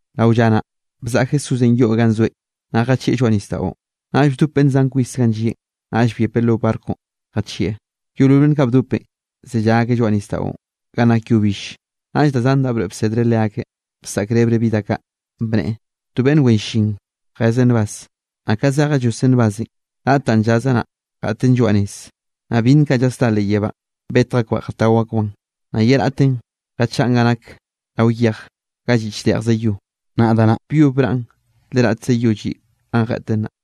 Rao lla naꞌ, bzaꞌa Jesúsenꞌ yoꞌ ganꞌ zoeꞌ naꞌ jachieꞌ lloaꞌ nisdaꞌon. Naꞌll bdop beꞌnn zan kwis ganꞌ llieꞌn, naꞌll byepeꞌ lo barconꞌ jachieꞌ. Yeolol beꞌnn kaꞌ bdopenꞌ zellá akeꞌ lloaꞌ nisdaꞌon ga nak yo bill. Naꞌll da zan da broeꞌ bsedreꞌ leakeꞌ bsaꞌkrebreꞌ bi da kaꞌ, bneꞌe: —To beꞌnn wen llin jezeꞌ nbaz, naꞌ ka zejeꞌ lloseꞌ nbazenꞌ, raꞌt danꞌ llazeꞌ naꞌ, jeꞌten lloaꞌ nez, naꞌ byinn kaꞌ llasdá leꞌ yebánꞌ betj akbaꞌ jatao akbaꞌn. Naꞌ ye raꞌtenꞌ jachaꞌn ga nake rao yej ga lliꞌ chdeꞌjze yo, naꞌ da naꞌ, byob braꞌn le raꞌtze yo lliꞌ ganꞌ jeꞌten naꞌ.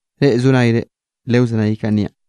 Reꞌ zo nayre, lewzenay kaꞌn niaꞌn.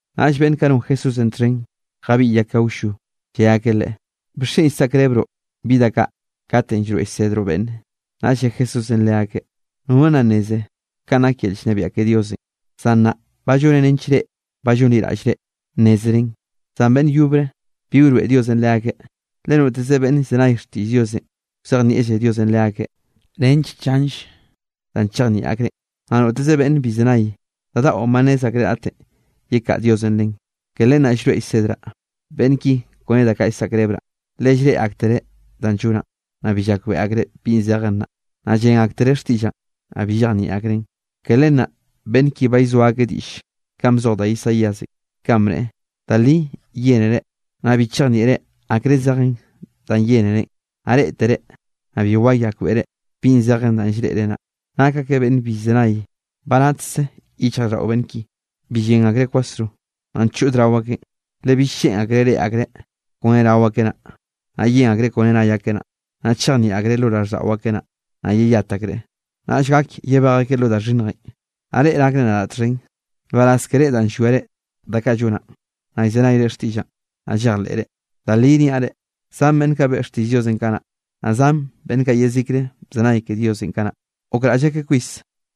Naꞌll beꞌnn kaꞌ non Jesúsenꞌ txhen jabiꞌy akeꞌ awllo, lle akeꞌ Leꞌe: —¿Bixchen llsaꞌkrebroꞌ bi da kaꞌ katenꞌ llroeꞌ llsedroꞌ beꞌnne? Naꞌll lle Jesúsenꞌ leakeꞌ: —Nono nna nneze kanꞌ nak yel llnebiaꞌ ke Diosenꞌ, zan nnaꞌ ba lloneꞌ nench reꞌ ba llonliraꞌllre nnézeren. Zan beꞌnn yobre bi wroeꞌ Diosenꞌ leakeꞌ. Le noteze beꞌnn llzenay xtiꞌll Diosenꞌ wzejnieꞌlle Diosenꞌ leakeꞌ, nench chanll danꞌ chejnieꞌ akreꞌn, naꞌ noteze beꞌnne bi llzenay, da daꞌon ba nnez akreꞌ raꞌten, yekaꞌa Diosenꞌ len. Ke len naꞌ llroeꞌ llsedraꞌ beꞌnn ki kone da kaꞌ llsaꞌkrebraꞌ, le llreꞌe aktereꞌ danꞌ llonaꞌn, naꞌ bi llakbeꞌe akreꞌ bi zejen naꞌ, llen aktereꞌ xtiꞌllaꞌn, naꞌ bi llejnieꞌ akreꞌn. Ke len naꞌ beꞌnn ki ba llzoa akeꞌ diꞌll kanꞌ bzoj da Isaíasenꞌ, kanꞌ bneꞌe: Da li yénere, naꞌ bi chejnieꞌre akre zejen daꞌn yénerenꞌ. Naꞌ reꞌtere, naꞌ bi wayakbeꞌre bi zejen danꞌ llreꞌre naꞌ. Nak akeꞌ beꞌnn bi llzenay, ba natkze yichjraꞌlldaꞌo beꞌnn ki. Bi llen akreꞌ kwasro, naꞌ nchod rao akeꞌn, le bill lleꞌn akreꞌ reꞌe akreꞌ kone rao akeꞌ naꞌ, naꞌ yen akreꞌ kone nay akeꞌ naꞌ, naꞌ chejnieꞌ akreꞌ lo raꞌlldaꞌo akeꞌ naꞌ, naꞌ yeyat akreꞌ, naꞌll gak yebej akeꞌ lo da xhinnjenꞌ. ’Naꞌ reꞌ nakre nadaꞌ txhen, nbaraz keré danꞌ llwiare da kaꞌ llonaꞌn, naꞌ llzenayre xtiꞌllaꞌn, naꞌ llejleꞌre. Da li niaꞌ reꞌ, zan beꞌnn kaꞌ beꞌe xtiꞌll Diosenꞌ kanaꞌ, naꞌ zan beꞌnn kaꞌ yezikre bzenay ke Diosenꞌ kanaꞌ, gokraꞌll akeꞌ kwis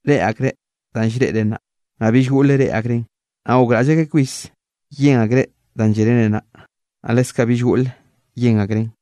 reꞌe akreꞌ danꞌ llreꞌre nnaꞌ, naꞌ bill goꞌle reꞌe akreꞌn. Naꞌ gokraꞌll akeꞌ kwis yen akreꞌ danꞌ llénere naꞌ, naꞌ leskaꞌ bill goꞌle yen akreꞌn.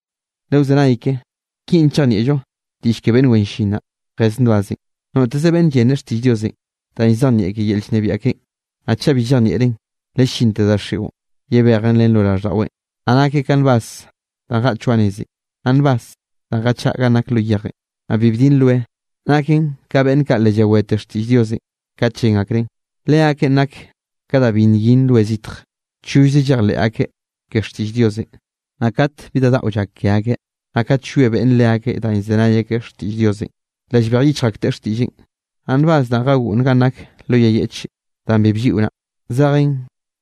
’Lewzenay ke, kinꞌ chejnieꞌllo diꞌll ke beꞌnn wen llin naꞌ, jez nbazenꞌ. Noteze beꞌnn llene xtiꞌll Diosenꞌ danꞌ llzejnieꞌ ke yel llnebiaꞌ keꞌen, naꞌ chaꞌ bi llejnieꞌreꞌn, le llinte daxiꞌon llabejen len lo raꞌlldaꞌweꞌn; naꞌ nakeꞌ ka nbaz danꞌ jeꞌt lloaꞌ nezenꞌ. Naꞌ nbaz danꞌ jachaꞌa ganꞌ nak lo yejenꞌ, naꞌ bi bdin roe, naken ka beꞌnn kaꞌ le llawete xtiꞌll Diosenꞌ kat llen akreꞌn, leakeꞌn nak ka da bi nyin roe zitj, chollze llejleꞌ akeꞌ ke xtiꞌll Diosenꞌ, naꞌ kat bi da daꞌo llak ke akeꞌ, naꞌ kat llwie beꞌnne leakeꞌ danꞌ llzenay akeꞌ xtiꞌll Diosenꞌ, le llbej yichj akteꞌ xtiꞌlleꞌn. Naꞌ nbaz danꞌ jagoꞌnn ganꞌ nak lo yay yeꞌche danꞌ bi blliꞌo naꞌ, zejen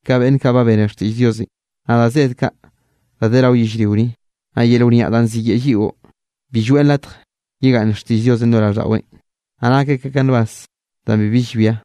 ka beꞌnn kaꞌ ba bene xtiꞌll Diosenꞌ, naꞌ da zed kaꞌ da de rao yellrio ni, naꞌ yel wniaꞌ danꞌ ziyeꞌe lliꞌo, bi lloeꞌn latje yegaꞌnn xtiꞌll Diosenꞌ lo raꞌlldaꞌweꞌn, naꞌ nak akeꞌ ka nbaz danꞌ bibi llbia.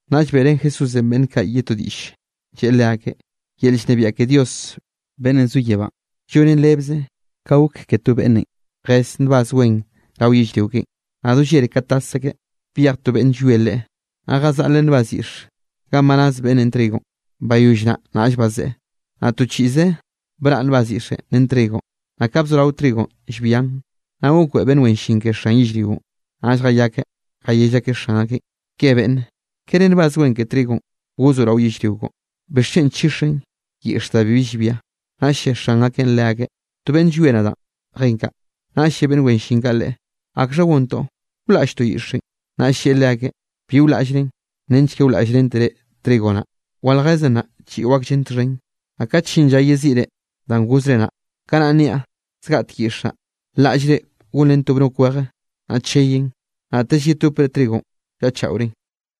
Naꞌll beꞌrén Jesúsenꞌ beꞌnn kaꞌ ye to diꞌll, lleꞌe leakeꞌ: —Yel llnebiaꞌ ke Dios beꞌnnenꞌ zo yebánꞌ llonen rebze ka gok ke to beꞌnnenꞌ jez nbaz wen rao yellrio keꞌen. Naꞌ do llere ka tas akeꞌ, byej to beꞌnn llwie leꞌe, naꞌ jazaꞌleꞌ nbaz yiꞌx ganꞌ ba naz beꞌnnenꞌ trigonꞌ, bayoll naꞌ naꞌll bazeꞌe. Naꞌ to chiꞌze braꞌ nbaz yiꞌxenꞌ ren trigonꞌ, naꞌ ka bzorao trigonꞌ llbian. Naꞌ gokbeꞌe beꞌnn wen llin ke xan yellrionꞌ, naꞌll jayakeꞌ jayell akeꞌ xan akeꞌn: “Ke beꞌnne, ¿kere nbaz wen ke trigonꞌ gozoꞌ rao yellrio koꞌon? ¿Bixchen nchixzen yiꞌxe da bibi llbia?” Naꞌll lle xan akeꞌn leakeꞌ: “To beꞌnn llwie nadaꞌn jen kaꞌ.” Naꞌll lle beꞌnn wen llin kaꞌ leꞌe: “¿Akxha gontoꞌ? ¿Wlaꞌlltoꞌ yiꞌxenꞌ?” Naꞌ lleꞌe leakeꞌ: “Bi wlaꞌllren nench ke wlaꞌllrentere trigo naꞌ. Waljezen naꞌ chiꞌo akllen txhen. Naꞌ kat llin lla yeziꞌre danꞌ gozre naꞌ, kanaꞌ niaꞌ zgaꞌtek yiꞌx naꞌ, laꞌllre gonren to bnok weje, naꞌ cheyen, naꞌtelle yetopre trigonꞌ wllaꞌchaꞌoren.”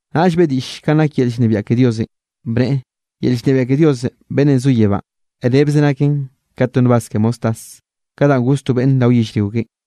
Naꞌll beꞌe diꞌll kanꞌ nak yel llnebiaꞌ ke Diosenꞌ, bneꞌe: —Yel llnebiaꞌ ke Dios beꞌnnenꞌ zo yebánꞌ rebze naken ka to nbaz ke mostaz, ka danꞌ goz to beꞌnn rao yellrio keꞌen.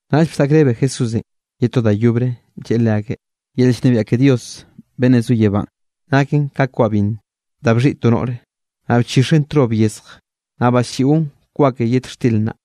Naꞌll bsaꞌkrebe Jesúsenꞌ ye to da yobre, lleꞌe leakeꞌ: —Yel llnebiaꞌ ke Dios beꞌnnenꞌ zo yebánꞌ, naken ka kwa binn da bxhiꞌi to noꞌre, naꞌ bchixeꞌn trob yezj, naꞌ baslliꞌon kwa ke yet xtir naꞌ.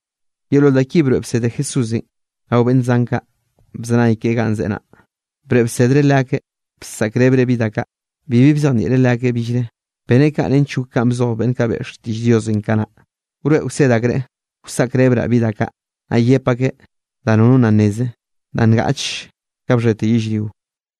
Yeolol da ki broeꞌ bsede Jesúsenꞌ rao beꞌnn zan kaꞌ bzenay keꞌen ganꞌ zeꞌe naꞌ. Broeꞌ bsedreꞌ leakeꞌ, bsaꞌkrebreꞌ bi da kaꞌ, bibi bzejnieꞌreꞌ leakeꞌ billre. Beneꞌ kaꞌ nench gok kanꞌ bzoj beꞌnn kaꞌ beꞌe xtiꞌll Diosenꞌ kanaꞌ: Wroeꞌ wsed akreꞌ, wsaꞌkrebraꞌ bi da kaꞌ, naꞌ yep akeꞌ da nono nna nneze, da ngaꞌch ka bxhete yellrio.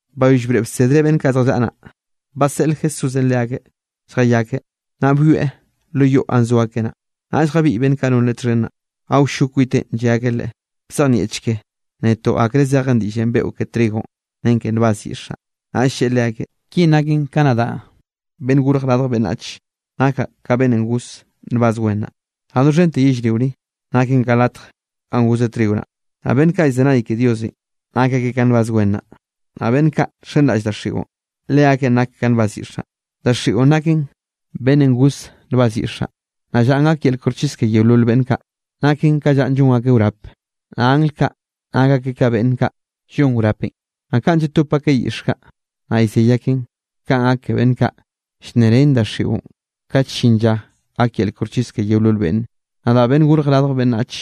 Bayoll broeꞌ bsedreꞌ beꞌnn kaꞌ zjallaꞌa naꞌ, baseꞌl Jesúsenꞌ leakeꞌ lljayakeꞌ. Naꞌ byoeꞌ lo yoꞌ ganꞌ zo akeꞌ naꞌ, naꞌll jabiꞌy beꞌnn kaꞌ non Leꞌe txhen naꞌ, awllo kwiteꞌn lle akeꞌ Leꞌe: —Bzejnieꞌcheke netoꞌ akre zeje diꞌllenꞌ beꞌon ke trigonꞌ ren nbaz yiꞌx naꞌ. Naꞌll lleꞌe leakeꞌ: —Kinꞌ naken: ka nadaꞌ Beꞌnnenꞌ Gorj Radj Beꞌnnach, nakaꞌ ka beꞌnnenꞌ goz nbaz wen naꞌ. Naꞌ doxhente yellrio ni, naken ka latj ganꞌ gozeꞌ trigo naꞌ. Naꞌ beꞌnn kaꞌ llzenay ke Diosenꞌ nak akeꞌ ka nbaz wen naꞌ. Naꞌ beꞌnn kaꞌ nxenraꞌll daxiꞌon leakeꞌn nak ka nbaz yiꞌx naꞌ. Daxiꞌon naken beꞌnnenꞌ goz nbaz yiꞌx naꞌ. Naꞌ llanꞌ gak yel koxchis ke yeolol beꞌnn kaꞌ naken ka llanꞌ llon akeꞌ wrape, naꞌ angl kaꞌ nak akeꞌ ka beꞌnn kaꞌ llon wrapenꞌ. Naꞌ kanꞌ llatop akeꞌ yiꞌx kaꞌ, naꞌ llzey akenꞌ, kaꞌn gak ke beꞌnn kaꞌ llnnerén daxiꞌon kat llin lla gak yel koxchis ke yeolol beꞌnne. Nadaꞌ, Beꞌnnenꞌ Gorj Radj Beꞌnnach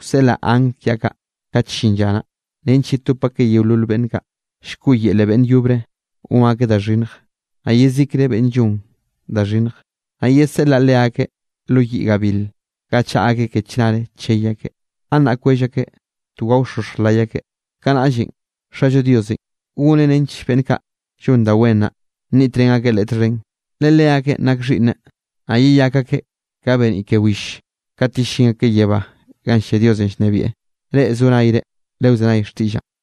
wseꞌlaꞌ angl kiaꞌ kaꞌ kat llin lla naꞌ, nench yetop akeꞌ yeolol beꞌnn kaꞌ, llkoꞌyele beꞌnne yobre gon akeꞌ da xhinnj, naꞌ yezikre beꞌnn llon da xhinnj. Naꞌ yeseꞌleꞌ leakeꞌ lo yiꞌ gabil ga chaꞌa akeꞌ ke chnare chey akeꞌ, gannaꞌ kwell akeꞌ, to gaoxoxj lay akeꞌ. Kanaꞌllenꞌ Xallo Diosenꞌ goneꞌ nench beꞌnn kaꞌ llon da wen naꞌ, nniꞌtrén akeꞌ Leꞌe txhen, le leakeꞌn nak xhiꞌnneꞌ, naꞌ yeyak akeꞌ ka beniꞌ ke will kat yellín akeꞌ yebá ganꞌ llia Diosenꞌ llnebieꞌ. Reꞌ zo nayre lewzenay xtiꞌllaꞌn.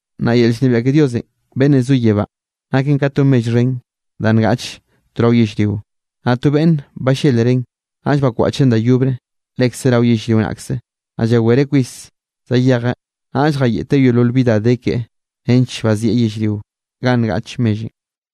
’Naꞌ Yel llnebiaꞌ ke Dios beꞌnnenꞌ zo yebánꞌ naken ka to mell xhen da ngaꞌche to rao yellrio. Naꞌ to beꞌnne ballelreꞌn, naꞌll bakwaꞌcheꞌn da yobre lekze rao yellrio naꞌkze, naꞌ llawereꞌ kwis zayejeꞌ, naꞌll jayeꞌte yeolol bi da de keꞌe nench bazieꞌ yellrio ganꞌ ngaꞌch mellenꞌ.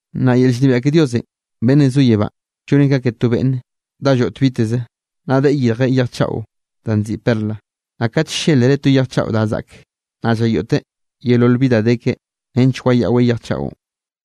’Naꞌ yel llnebiaꞌ ke Dios beꞌnnenꞌ zo yebánꞌ llonen ka ke to beꞌnn dá lloꞌt biteze, naꞌ deꞌe yirjeꞌ yej chaꞌo danꞌ nziꞌi perla. Naꞌ kat ll-llelreꞌ to yej chaꞌo da zaꞌk, naꞌ llayoꞌteꞌ yeolol bi da de keꞌe nench wayaꞌweꞌ yej chaꞌon.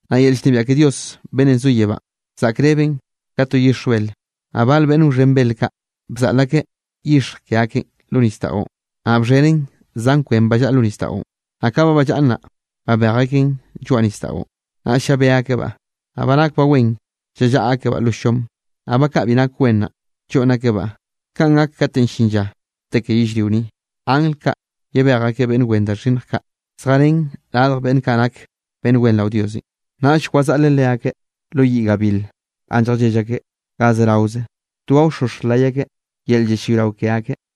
’Naꞌ yel llnebiaꞌ ke Dios beꞌnnenꞌ zo yebánꞌ zaꞌkrebren ka to yixj bel. Naꞌ bal beꞌnn wxhen bel kaꞌ bzaꞌl akeꞌ yixj ke akeꞌn lo nisdaꞌon, naꞌ bxhenen zan kwen ba llaꞌa lo nisdaꞌon. Naꞌ ka ba ballaꞌn naꞌ, babej akeꞌn lloaꞌ nisdaꞌon, naꞌll llabé akebaꞌ, naꞌ ba nak wen, llallaꞌa akebaꞌ lo llom. Naꞌ ba kaꞌ bi nak wen naꞌ, lloꞌnn akebaꞌ. Kanꞌ gak katenꞌ llin lla, te ke yellrio ni. Angl kaꞌ yebej akeꞌ beꞌnn wen da xhinnj kaꞌ zjarén radj beꞌnn kaꞌ nake beꞌnn wen rao Diosenꞌ. Naꞌll wazaꞌleꞌ leakeꞌ lo yiꞌ gabil ganꞌ lljallell akeꞌ ga zeraoze to gaoxoxj lay akeꞌ yel llallayrao ke akeꞌ.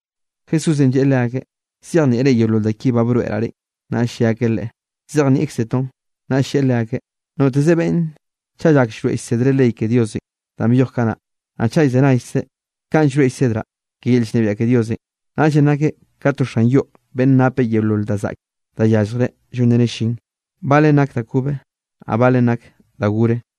Jesúsenꞌ lleꞌe leakeꞌ: —¿Zyejnieꞌre yeolol da ki ba broeꞌraꞌ reꞌn? Naꞌll lle akeꞌ Leꞌe: —Zyejnieꞌkzetoꞌn. Naꞌll lleꞌe leakeꞌ: —Noteze beꞌnne chaꞌ llak llroeꞌ llsedreꞌ ley ke Diosenꞌ danꞌ byoj kanaꞌ, naꞌ chaꞌ llzenaykzeꞌ kanꞌ llroeꞌ llsedraꞌ ke yel llnebiaꞌ ke Diosenꞌ, naꞌllenꞌ nakeꞌ ka to xan yoꞌ beꞌnne napeꞌ yeolol da zaꞌke da yalljreꞌ llonreneꞌ llin, balen nak da kobe, naꞌ balen nak da gore.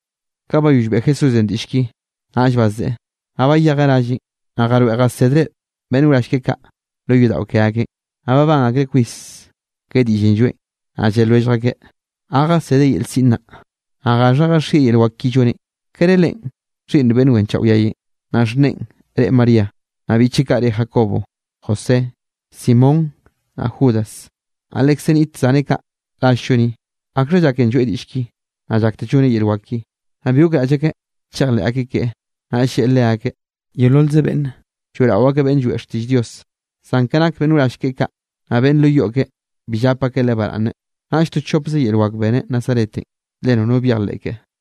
Ka bayoll beꞌe Jesúsenꞌ diꞌll ki, naꞌll bazeꞌe. Naꞌ bayejeꞌ ralleꞌn, naꞌ jaroeꞌ jasedreꞌ beꞌnn wrall keꞌe kaꞌ lo yodaꞌo ke akeꞌn. Naꞌ babán akreꞌ kwis ke diꞌllenꞌ lloeꞌn, naꞌ lle lwellj akeꞌ: —¿Ga jasedeꞌ yel siꞌn naꞌ? ¿Naꞌ gaxha jaxieꞌ yel wak ki lloneꞌ? ¿Kere leꞌen xhiꞌnn beꞌnn wenchaꞌo yayenꞌ, naꞌ xhneꞌen reꞌe María? Naꞌ biꞌcheꞌ kaꞌ re Jacobo, José, Simón naꞌ Judas. Naꞌ lekze niꞌt zaneꞌ kaꞌ rall-llo ni. ¿Akxha llaken lloeꞌ diꞌll ki, naꞌ llakteꞌ lloneꞌ yel wak ki? Naꞌ bi gokraꞌll akeꞌ chejleꞌ akeꞌ keꞌe, naꞌll lleꞌe leakeꞌ: —Yeololze beꞌnne lloeꞌrao akeꞌ beꞌnn lloeꞌ xtiꞌll Dios, zan ka nak beꞌnn wrall keꞌe kaꞌ, naꞌ beꞌnn lo yoꞌ keꞌe bi llap akeꞌ leꞌe baraꞌnne. Naꞌll to chopze yel wak beneꞌ Nazaretenꞌ le nono byejleꞌ keꞌe.